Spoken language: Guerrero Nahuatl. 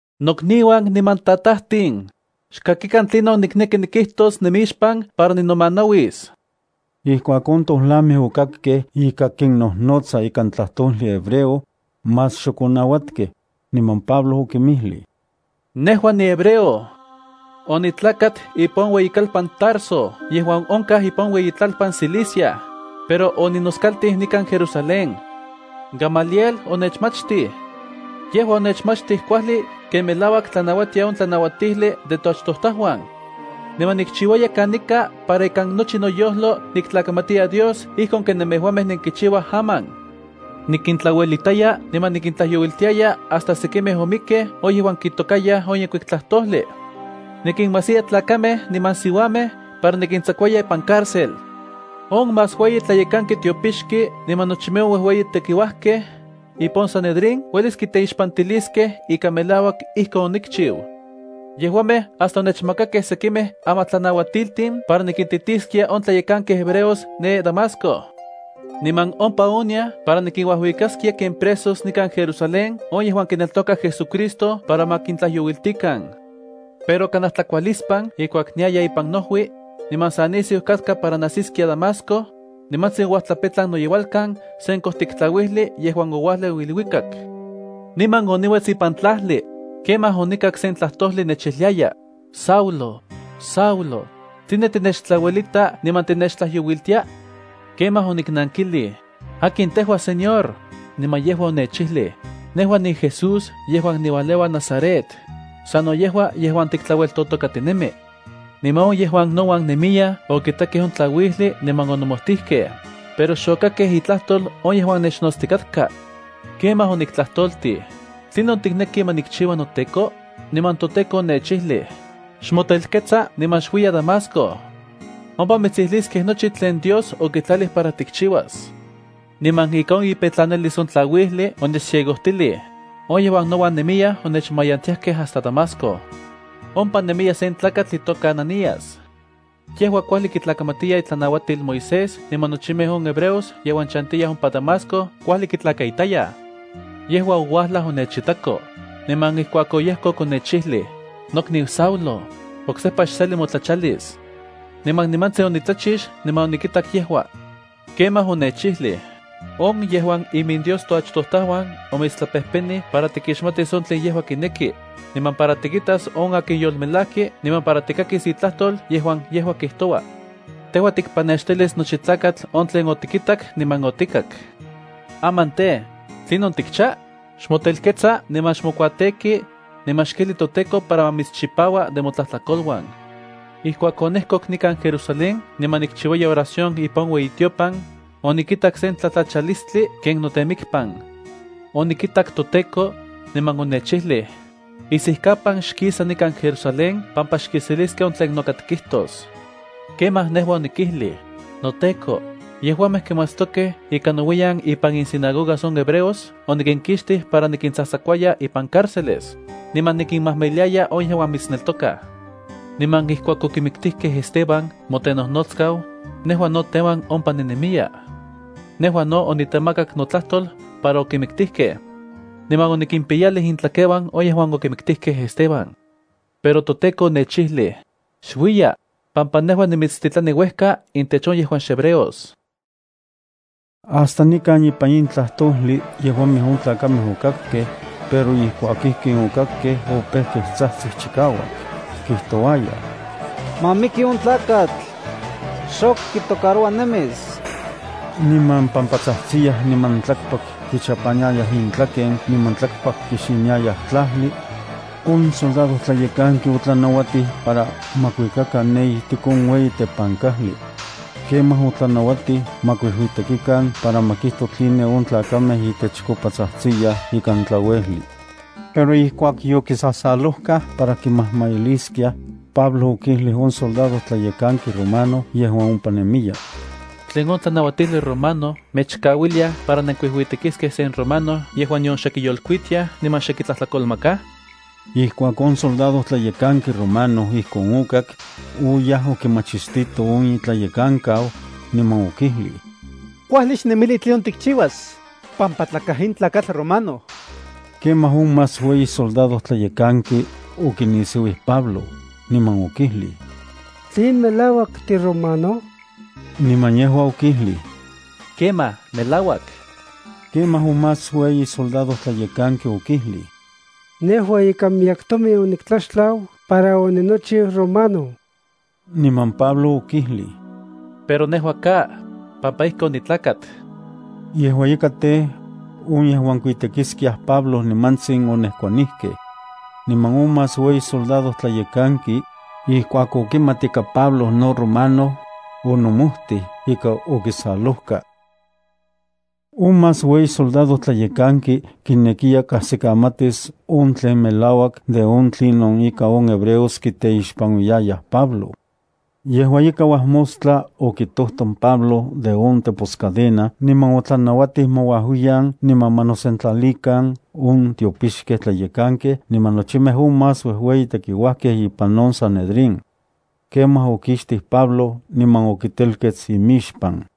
—Nokniuan niman tatajtin, xkakikan tlinon nikneki nikijtos nemixpan para ninomanauis. Ijkuak on tojlamej okakkej ika kinnojnotsa ikan tlajtojli hebreo, más xok onauatkej, niman Pablo okinmijlij: —Nejua nihebreo. Onitlakat ipan on ueyikalpan Tarso yejuan onkaj ipan iueyitlalpan Cilicia, pero oninoskaltij nikan Jerusalén. Gamaliel onechmachtij. Yejua onechmachtij kuajli ken melauak tlanauatia on tlanauatijli de toachtojtajuan. Niman nikchiuaya kanika para ikan nochi noyojlo niktlakamatiya Dios ijkon ken nemejuamej nenkichiuaj aman. Nikintlauelitaya niman nikintlajyouiltiaya hasta sekimej omikkej on yejuan kitokayaj on Yenkuik Tlajtojli. Nikinmajsiya tlakamej niman siuamej para nikintsakuaya ipan cárcel. On más ueyi tlayekanki tiopixki niman nochimej on uejueyi tekiuajkej ipan on Sanedrín uelis kiteixpantiliskej ika melauak ijkon onikchiu. Yejuamej hasta onechmakakej sekimej amatlanauatiltin para nikintitiskia on tlayekankej hebreos ne Damasco. Niman ompa oniaj para nikinuajuikaskia ken presos nikan Jerusalén on yejuan kineltokaj JesuCristo para ma kintlajyouiltikan. ’Pero kanaj tlakualispan ijkuak niaya ipan noojui, niman sa nisiu katka para najsiskia Damasco, nimantsin ouajtlapetlan noyeualkan sen kojtik tlauijli yejuan oualeu iluikak. Niman oniuets ipan tlajli. Kemaj onikak sen tlajtojli nechijliaya: “Saulo, Saulo, ¿tline tinechtlauelita niman tinechtlajyouiltia?” Kemaj oniknankilij: “¿Akin tejua Señor?” Niman yejua onechijlij: “Nejua niJesús yejuan niualeua Nazaret, sano yejua yejuan tiktlaueltotokatinemi.” Niman on yejuan nouan nemiyaj okitakej on tlauijli niman onomojtijkej, pero xokakkej itlajtol on yejuan nechnotstikatka. Kemaj oniktlajtoltij: “¿Tlinon tikneki ma nikchiua noTEKO?” Niman toTEKO onechijlij: “Xmotelkets niman xuiya Damasco. Ompa mitsijliskej nochi tlen Dios okitlalij para tikchiuas.” Niman ika on ipetlanalis on tlauijli onechciegojtilij, on yejuan nouan nemiyaj onechmayantiajkej hasta Damasco. ’Ompa nemiya sen tlakatl itoka Ananías. Yejua kuajli kitlakamatiya itlanauatil Moisés niman nochimej on hebreos yejuan chantiyaj ompa Damasco kuajli kitlakaitayaj. Yejua ouajlaj onechitako, niman ijkuak oyejkok onechijlij: “Nokniu Saulo, oksejpa xseli motlachalis.” Niman nimantsin onitlachix niman onikitak yejua. Kemaj onechijlij: “On yejuan iminDios toachtojtajuan omitstlapejpenij para tikixmatis on tlen yejua kineki, niman para tikitas on akin Yolmelajki niman para tikakis itlajtol yejuan yejua kijtoua. Tejua tikpanextilis nochi tlakatl on tlen otikitak niman otikak. Aman tej, ¿tlinon tikcha? Xmotelkets niman xmokuateki, niman xkijli toTEKO para ma mitschipaua de motlajtlakoluan.” ’Ijkuak onejkok nikan Jerusalén niman nikchiuaya oración ipan on ueyitiopan, onikitak se tlatlachalistli ken notemikpan. Onikitak toTEKO, niman onechijlij: “Isijkapan xkisa nikan Jerusalén pampa xkiseliskej on tlen noka tikijtos.” Kemaj nejua onikijlij: “NoTEKO, yejuamej kimatstokej ika nouiyan ipan insinagogas on hebreos onikinkixtij para nikintsakuaya ipan cárceles, niman nikinmajmailiaya on yejuan mitsneltokaj. Niman ijkuak okimiktijkej Esteban motenojnotskau, nejua no teuan ompa ninemiya. Nejua no oniktemakak notlajtol para okimiktijkej. Niman onikimpiyalij intlakeuan on yejuan okimiktijkej Esteban.” Pero toTEKO onechijlij: “Xuiya, pampa nejua nimitstitlani uejka intech on yejuan xhebreos.” Hasta nikan ipan in tlajtojli yejuamej on tlakamej okakkej, pero ijkuak ijkin okakkej opejkej tsajtsij chikauak, kijtouayaj: —¡Ma miki on tlakatl! ¡Xok kitocaroua nemis! Niman pampa tsajtsiyaj niman tlakpak kichapaniayaj intlaken niman tlakpak kixiniayaj tlajli, on soldadojtlayekanki otlanauatij para ma kuikakan ne ijtik on ueyi tepankajli. Kemaj otlanauatij ma kuijuitekikan para ma kijto tline on tlakamej itechkopa tsajtsiyaj ikan tlauejli. Pero ijkuak yokisasalojkaj para kimajmailiskiaj, Pablo okijlij on soldadojtlayekanki romano yejuan ompa nemiya: —¿Tlen on tlanauatijli romano mechkauiliaj para nenkuijuitekiskej sen romano yejuan nion xe kiyolkuitiaj niman xe kitlajtlakolmakaj? Ijkuak on soldadojtlayekanki romano ijkon okak, oyaj okimachistito on itlayekankau, niman okijlij: —Kuajli xnemili tlinon tikchiuas, pampa tlakaj in tlakatl romano. Kemaj on más ueyi soldadojtlayekanki okinisiuij Pablo, niman okijlij: —¿Tlen melauak tiromano? Niman yejua okijlij: —Kemaj, melauak. Kemaj on más ueyi soldadojtlayekanki okijlij: —Nejua ika miyek tomin oniktlaxtlau para oninochiu romano. Niman Pablo okijlij: —Pero nejua ka, pampa ijki onitlakat. Yejua ika itej, on yejuan kuitekiskiaj Pablo nimantsin onejkuanijkej. Niman on más ueyi soldadojtlayekanki, ijkuak okimat ika Pablo no romano, onomojtij ika okisalojka. On más ueyi soldadojtlayekanki kinekiya kajsikamatis on tlen melauak de on tlinon ika on hebreos kiteixpanuiyaj Pablo. Yejua ika, uajmostla okitojton Pablo de on teposcadena niman otlanauatij ma uajuiyan niman ma nosentlalikan on tiopixkej tlayekankej niman nochimej on más uejueyi tekiuajkej ipan on Sanedrín. Kemaj okixtij Pablo niman okitelkets imixpan.